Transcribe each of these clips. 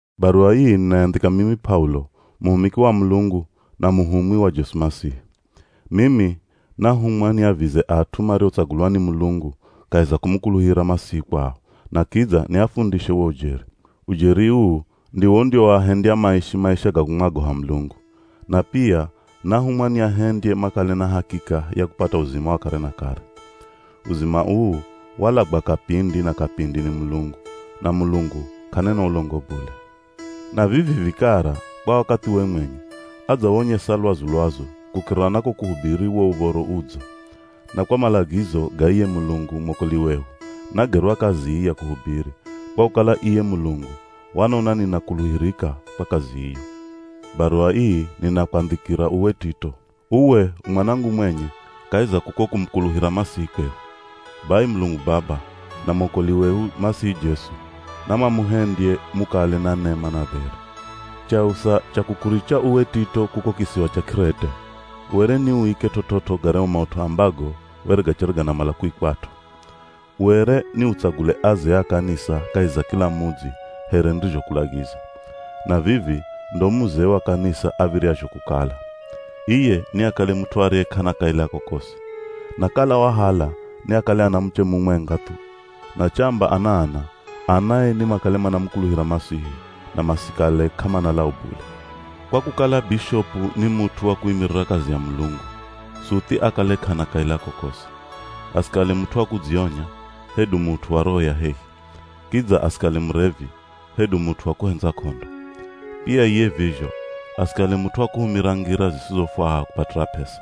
Baruwa ii ninayandhika mimi P'aulo, muhumiki wa Mulungu, na muhumwi wa Jesu Masihi. Mimi nahumwa niavize at'u mariotsagulwa ni Mulungu kahi za kumukuluhira Masihi kwao, na kidza niafundishe wo ujeri. Ujeri uu ndiwo undiwoahendya maishi maisha ga kumwagoha Mulungu. Na pia nahumwa niahendye makale na hakika ya kupata uzima wa kare na kare. Uzima uu walagwa kapindi na kapindi ni Mulungu, na Mulungu k'anena ulongo bule. Na vivi vikara kwa wakathiwe mwenye, adzawonyesa lwazu-lwazu kukirira na ko kuhubiri wo Uv̱oro Udzo. Na kwa malagizo ga iye Mulungu mwokoli wehu, nagerwa kazi ii ya kuhubiri, kwa kukala iye Mulungu wanona ninakuluhirika kwa kazi iyo. Baruwa ii ninakwandhikira uwe Tito. Uwe u mwanangu mwenye kahi za kuko kumukuluhira Masihi kwehu. Bai Mulungu Baba, na mwokoli wehu Masihi Jesu, namamuhendye mukale na nema na dheri. Chausa cha kukuricha uwe Tito kuko kisiwa cha K'irete, were ni uike t'ot'ot'o garyahu maut'u ambago were gachere ganamala kuikwat'o. Were ni utsagule azee a kanisa kahi za kila mudzi here nirizhokulagiza. Na vivi ndo muzee wa kanisa av̱iryazho kukala: Iye niakale ni mut'u ariye k'ana kaila kokosi. Na kala wahala niakale ana muche mumwenga thu. Na chamba ana ana, anae nimakale manamukuluhira Masihi, na masikale k'amana lau bule. Kwa kukala bishopu ni mut'u wa kuimirira kazi ya Mulungu, suthi akale k'ana kaila kokosi. Asikale mut'u wa kudzionya, hedu mut'u wa roho ya hehi. Kidza asikale murevi, hedu mut'u wa kuhendza k'ondo. Pia iye vizho, asikale mut'u wa kuhumira ngira zisizofwaha kupatira p'esa.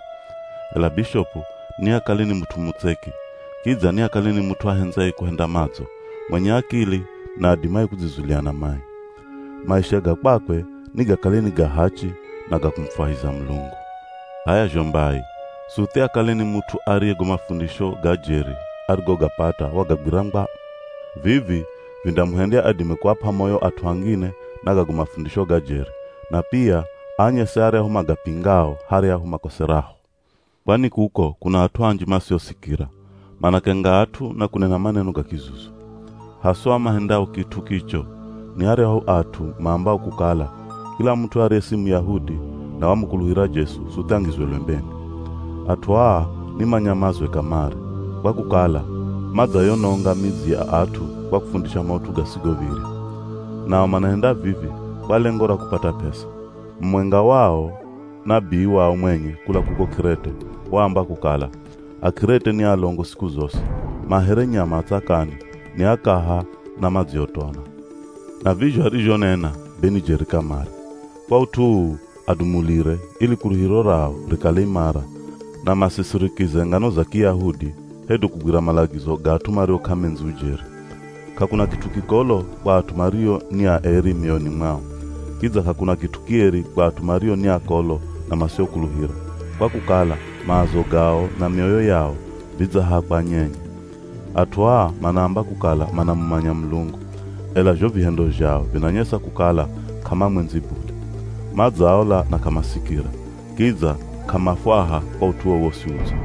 Ela bishopu niakale ni mut'u mutseki. Kidza niakale ni mut'u ahendzaye kuhenda madzo, mwenye akili na adimaye kudzizulia na mai. Maisha ga kwakwe nigakale ni ga hachi na ga kumufwahiza Mulungu. H'aya zho mbai, suthi akale ni mut'u ariye go mafundisho ga jeri arigogapata wagagwira ngwa. Vivi vindamuhendya adime kuap'a moyo at'u angine na gago mafundisho ga jeri, na pia aanyese aryahu magapingao haryahu makoseraho. Kwani kuko kuna at'u anji masiosikira, manakenga at'u na kunena maneno ga kizuzu. Haswa mahendao kit'u kicho, ni aryahu at'u maambao kukala kila mut'u ariye si Muyahudi na wamukuluhira Jesu suthi angizwe lwembeni. At'u aa ni manyamazwe kamare, kwa kukala madzayononga midzi ya at'u kwa kufundisha maut'u gasigov̱irya. Nao manahenda vivi kwa lengo ra kupata p'esa. Mumwenga wao, nabii wao mwenye kula kuko K'irete waamba kukala “Ak'irete ni alongo siku zosi, ma here nyama a tsakani, ni akaha na madziotona.” Na vizho arizhonena be ni jeri kamare. Kwa ut'u uu adumulire ili kuluhiro rao rikale imara na, masisirikize ngano za Kiyahudi hedu kugwira malagizo ga at'u mario k'amendzi ujeri. K'akuna kit'u kikolo kwa at'u mario ni aeri mioyoni mwao. Kidza k'akuna kit'u kieri kwa at'u mario ni akolo na masiokuluhira, kwa kukala maazo gao na mioyo yao vidzahakwa nyenye. At'u aa manaamba kukala manamumanya Mulungu, ela zho vihendo zhao vinanyesa kukala k'amamwendzi bule. Madzaola na k'amasikira, kidza k'amafwaha kwa ut'u wowosi udzo.